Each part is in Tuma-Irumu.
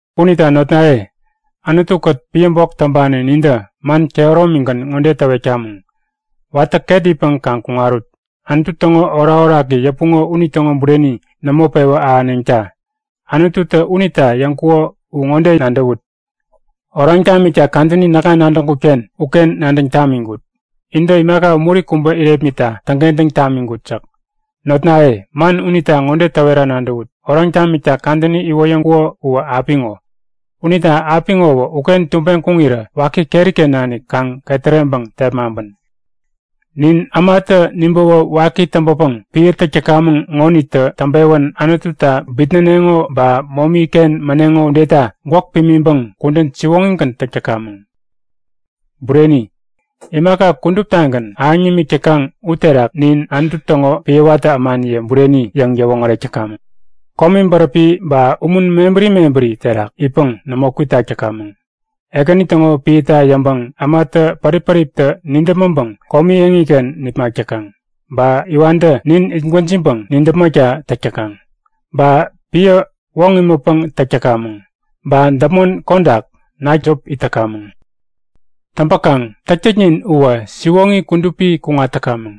Unita notnaye, Anutu-kät piä bok täŋpani nintä man kehäromigän ŋode täwetkamäŋ; Watä ket itpäŋ kaŋ kuŋarut! Anutu täŋo orakoraki yäpuŋo unitäŋo bureni nämo pewä ahäneŋta! Anututä unita yäŋkuko u ŋode nadäwut; Oraŋ tamikta kadäni näkŋa nadäŋkut-ken uken nadäŋ tamiŋkut. Intä imaka umuri kubä irepmitta täŋkentäŋ tamiŋkut yäk. Notnaye, man unita ŋode täwera nadäwut; Oraŋ tamikta kadäni iwoyäŋkuko uwä apiŋo. Unita apiŋowä uken tubeŋ kuŋirä waki keri-ken nanik kaŋ ketäreŋpäŋ tepmaŋpän! Nin ämatä nibäwä waki täŋpäpäŋ piä täk täkamäŋ ŋonitä täŋpewän Anututa bitnäneŋo ba momi-ken mäneŋo udeta gwäk pimiŋpäŋ kudän siwoŋigän täk täkamäŋ. Bureni, imaka kuduptagän ahäŋ nimik täkaŋ uterak nin Anutu täŋo piä watä ämaniye bureni yäŋ yäwoŋärek täkamäŋ; Komi bäräpi ba umun mebäri mebäri terak itpäŋ nämo kwitak täkamäŋ. Ekäni täŋo piäta yäŋpäŋ ämatä pärip-päriptä nidäpmäŋpäŋ komi eŋiken nipmak täkaŋ. Ba iwantä nin itgwäjiŋpäŋ nidäpmäkta täk täkaŋ. Ba piä, woŋ imätpäŋ täk täkamäŋ. Ba däpmon kodak, nakta jop it täkamäŋ. Täŋpäkaŋ täktäknin uwä, siwoŋi kudupi kuŋat täkamäŋ.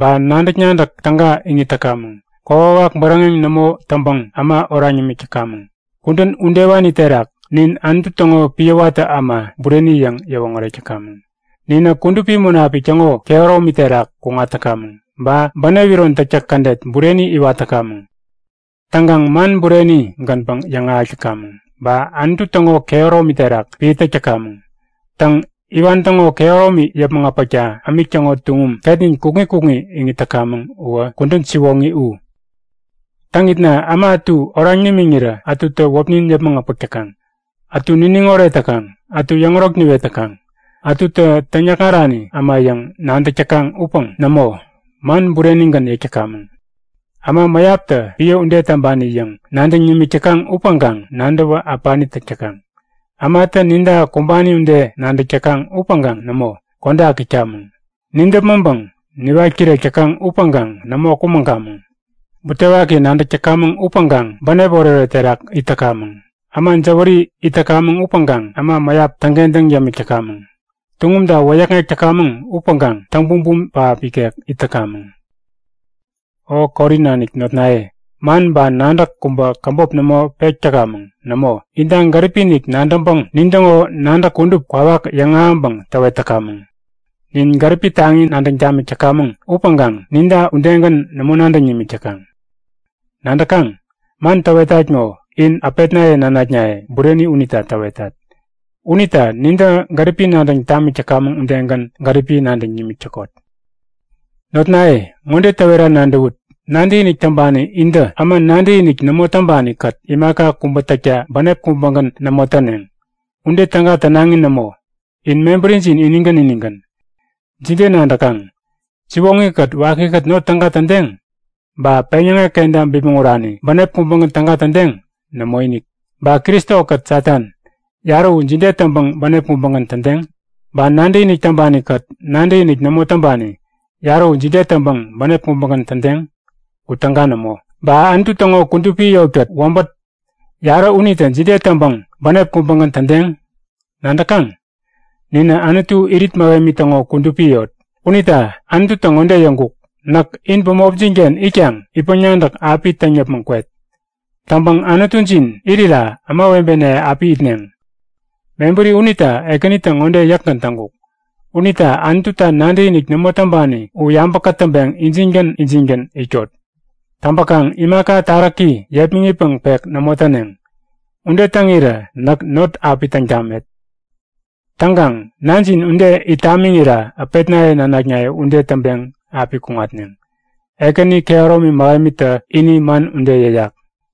Ba nadäk-nadäk täga iŋit täkamäŋ. Kokwawak bäräŋeŋ nämo täŋpäŋ äma oraŋ yämik täkamäŋ. Kudän udewani terak nin Anutu täŋo piä watä äma bureni yäŋ yäwoŋärek täkamäŋ. Ninä Kudupi Munapik täŋo kehäromi terak kuŋat täkamäŋ. Ba bänep iron täktäk kädet bureni iwat täkamäŋ. Täŋkaŋ man bureni-gänpäŋ yäŋahäk täkamäŋ. Ba Anutu täŋo kehäromi terak piä täk täkamäŋ. Täŋ, iwan täŋo kehäromi yäpmäŋ äpäkta ämik täŋo tuŋum ketnin kukŋi kukŋi iŋit täkamäŋ uwä kudän siwoŋi u. Täŋitna äma ätu oraŋ nimiŋirä ätutä wäpnin yäpmäŋ äpäk täkaŋ. Ätu niniŋ oret täkaŋ, ätu yäŋärok niwet täkaŋ. Ätutä täŋyäkŋarani äma yäŋ nadäk täkaŋ upäŋ nämo, man burenigän yäk täkamäŋ. Äma mäyaptä piä ude täŋpani yäŋ nadäŋ nimik täkaŋ upäŋkaŋ nadäwä äpani täk täkaŋ. Ämatä ninta kumbani ude nadäk täkaŋ upäŋkaŋ nämo, kodak itkamäŋ! Nidäpmäŋpäŋ niwat kirek täkaŋ upäŋkaŋ nämo kumäŋkamäŋ. Butewaki nadäk täkamäŋ upäŋkaŋ bänep oretoret terak it täkamäŋ. Äma jäwäri it täkamäŋ upäŋkaŋ äma mäyap täŋkentäŋ yämik täkamäŋ. Tuŋumta wäyäkŋek täkamäŋ upäŋkaŋ täŋbumbum pähap ikek it täkamäŋ. O Korin nanik notnaye, man ba nadäk kubä käbop nämo pek täkamäŋ. Nämo, inta gäripi-inik nadäŋpäŋ nintäŋo nadäk kudup kwawak yäŋahäŋpäŋ täwet täkamäŋ. Nin gäripi taŋi nadäŋ tamik täkamäŋ upäŋkaŋ ninta udegän nämo nadäŋ nimik täkaŋ. Nadäkaŋ? Man täwetat ŋo, in äpetnaye nanaknaye bureni unita täwetat. Unita nintä gäripi nadäŋ tamik täkamäŋ udegän gäripi nadäŋ nimik täkot. Notnaye, ŋode täwera nadäwut; Nadäkinik täŋpani intä äma nadäkinik nämo täŋpani-kät imaka kubä täkta bänep kubägän nämo täneŋ. Ude täga tänaŋi nämo. In mebärijin inigän inigän. Jide nadäkaŋ? Siwoŋi-kät wakikät not täga tädeŋ? Ba peŋyäŋek kenta bipmäŋ urani bänep kubägän täga tädeŋ? Nämoinik! Ba Kristo-kät Satan, yarä u jide täŋpäŋ bänep kubägän tädeŋ? Ba nadäkinik täŋpani-kät nadäkinik nämo täŋpani, yarä u jide täŋpäŋ bänep kubägän tädeŋ? U täga nämo! Ba Anutu täŋo kudupi yotkät wäbät, yarä unitä jide ude täŋpäŋ bänep kubägän tädeŋ? Nadäkaŋ? Ninä Anutu irit mähemi täŋo kudupi yot. Unita Anututä ŋode yäŋkuk; Näk in bämopjin-ken itkaŋ itpäŋ-nadäk api täŋ yäpmäŋ kwet. Täŋpäŋ Anutujin irira ämawebenaye api itneŋ. Mebäri unita Ekänitä ŋode yäkgän täŋkuk; Unita Anututa nadäkinik nämo täŋpani u yabä kätäŋpeŋ injingän injingän itkot. Täŋpäkaŋ imaka taräki yepmäŋitpäŋ-pek nämo täneŋ. Ude täŋirä näk not api täŋ tamet. Täŋkaŋ nanjin ude it tamiŋira äpetnaye nanaknaye ude täŋpeŋ api kuŋatneŋ. Ekäni kehäromi mähemitä ini man ude yäyak.